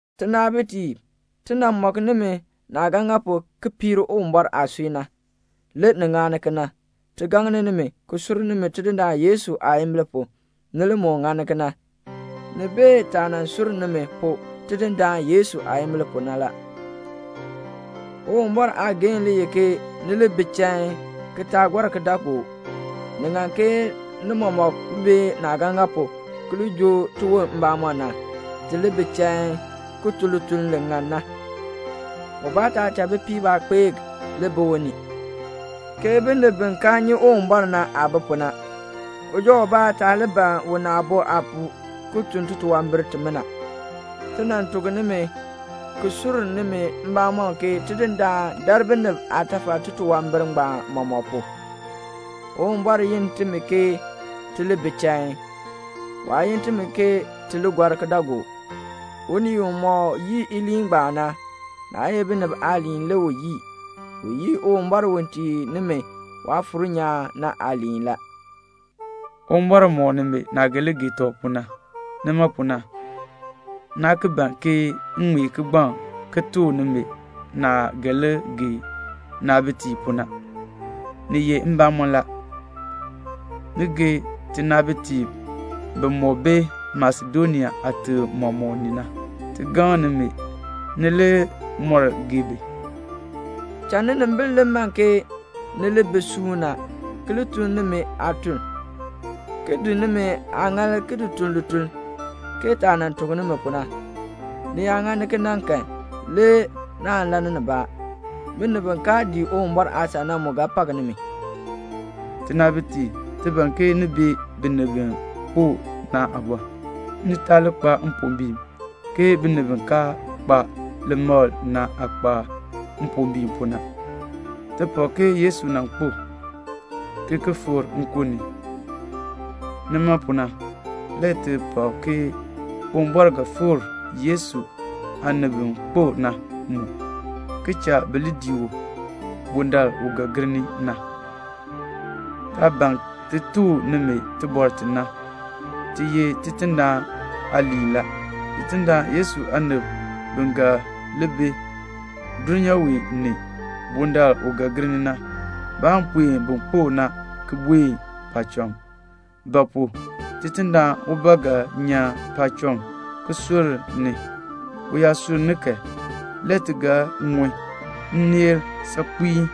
Tinaabitiib, ti nan mɔk nimi naah ga ŋa pu ki piir Uwumbɔr aasui na. Le ni ŋani kena. Ti gaŋni nimi, ki sur nimi Tidindaan Yesu aayimbil pu, ni li moo ŋani kena. Ni bee taah nan sur nimi pu Tidindaan Yesu aayimbil pu na la. Uwumbɔr aageehn le ye ke ni li bi chain, ki taa gɔr kidaagook. Ni ŋan ke ni mɔmɔk bee naah ga ŋa pu ki li joo tiwon mbamɔm na, ti li bi chain, ki tun lituln li ŋan na. Ubaa taa cha bipiib aakpeek li bi u ni, ke binib bi kaa nyi Uwumbɔr na aah bi pu na. Uja ubaa taa li ban una aabo aapuu ki tun titunwambir timina. Ti nan tuk nimi ki sur nimi mbamɔm ke Tidindaan dar binib aatafal titunwambir ngbaan mɔmɔk pu. Uwumbɔr yin timi ke ti li bi chain. Waa yin timi ke ti li gɔr kidaagook. Unii umɔk yii iliin ngbaan na, naa ye binib aaliin le u yii, u yii Uwumbɔr u tii nimi Waafuur nyaan na aaliin la. Uwumbɔr mɔk nimi naah ga li gee tɔb pu na. Nima pu na, naa ki ban ke m ŋmee kigbaŋ ki tuk nimi naah ga li gee ninaabitiib pu na. Ni ye mbamɔn la, ni gee tinaabitiib bimɔk bi Masedonia aatim mɔmɔk ni na. Ti gaŋni nimi, ni li moo gee bi. Cha ninimbil li man ke ni li bi suuna, ki li tun nimi aatuln, ki di nimi aaŋaal ki tun lituln, ke taah nan tuk nimi pu na. Ni yaa ŋani kena kan le naan lann nibaa; binib bi kaa dii Uwumbɔr aasan na mu ga pak nimi. Tinaabitiib, ti ban ke ni bee binib bi kpo na aabɔr, ni taa li kpa mpombiin, ke binib bi kaa kpa limakl na aah kpa mpombiin pu na. Ti pak ke Yesu nan kpo, ki ki fikr nkun ni. Nima pu na le ti pak ke Uwumbɔr ga fikr Yesu aanib bi kpo na mu, ki cha bi li dii u bundaln u ga gir ni na. Taah ban ti tuk nimi tibɔr ti na, ti ye Tidindaan aaliin la. Tidindaan Yesu aanib bi ga li bi dulnyaa wee ni bundaln u ga gir ni na, baan puen bin kpo na ki buen paacham. Ba pu? Tidindaan ubaa ga nyan paacham ki sunn ni. U yaa sunn ni kan, le ti ga ŋun nneel saakpiin,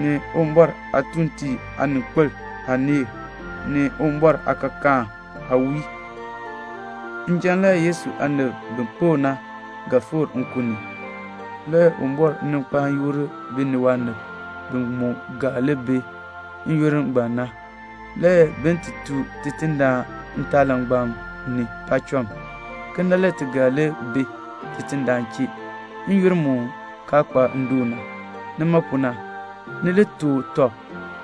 ni Uwumbɔr aatuuntiib aaninkpil aaneel, ni Uwumbɔr aakaakaan aawiil. Le Yesu aanib bi kpo na ga fikr nkun ni njan. Le Uwumbɔr ga kpaan yoor bi ni waanib bi mu ga li bi n-yoonn ngbaan na, le bin ti tooh Tidindaan ntaapaalangbam ni paacham. Kena le ti ga li bi Tidindaan chee n-yoonn mu kaa kpa ndoon na. Nima pu na, ni li tuk tɔb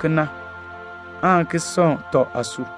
kena, aan ki sɔŋ tɔb aasui.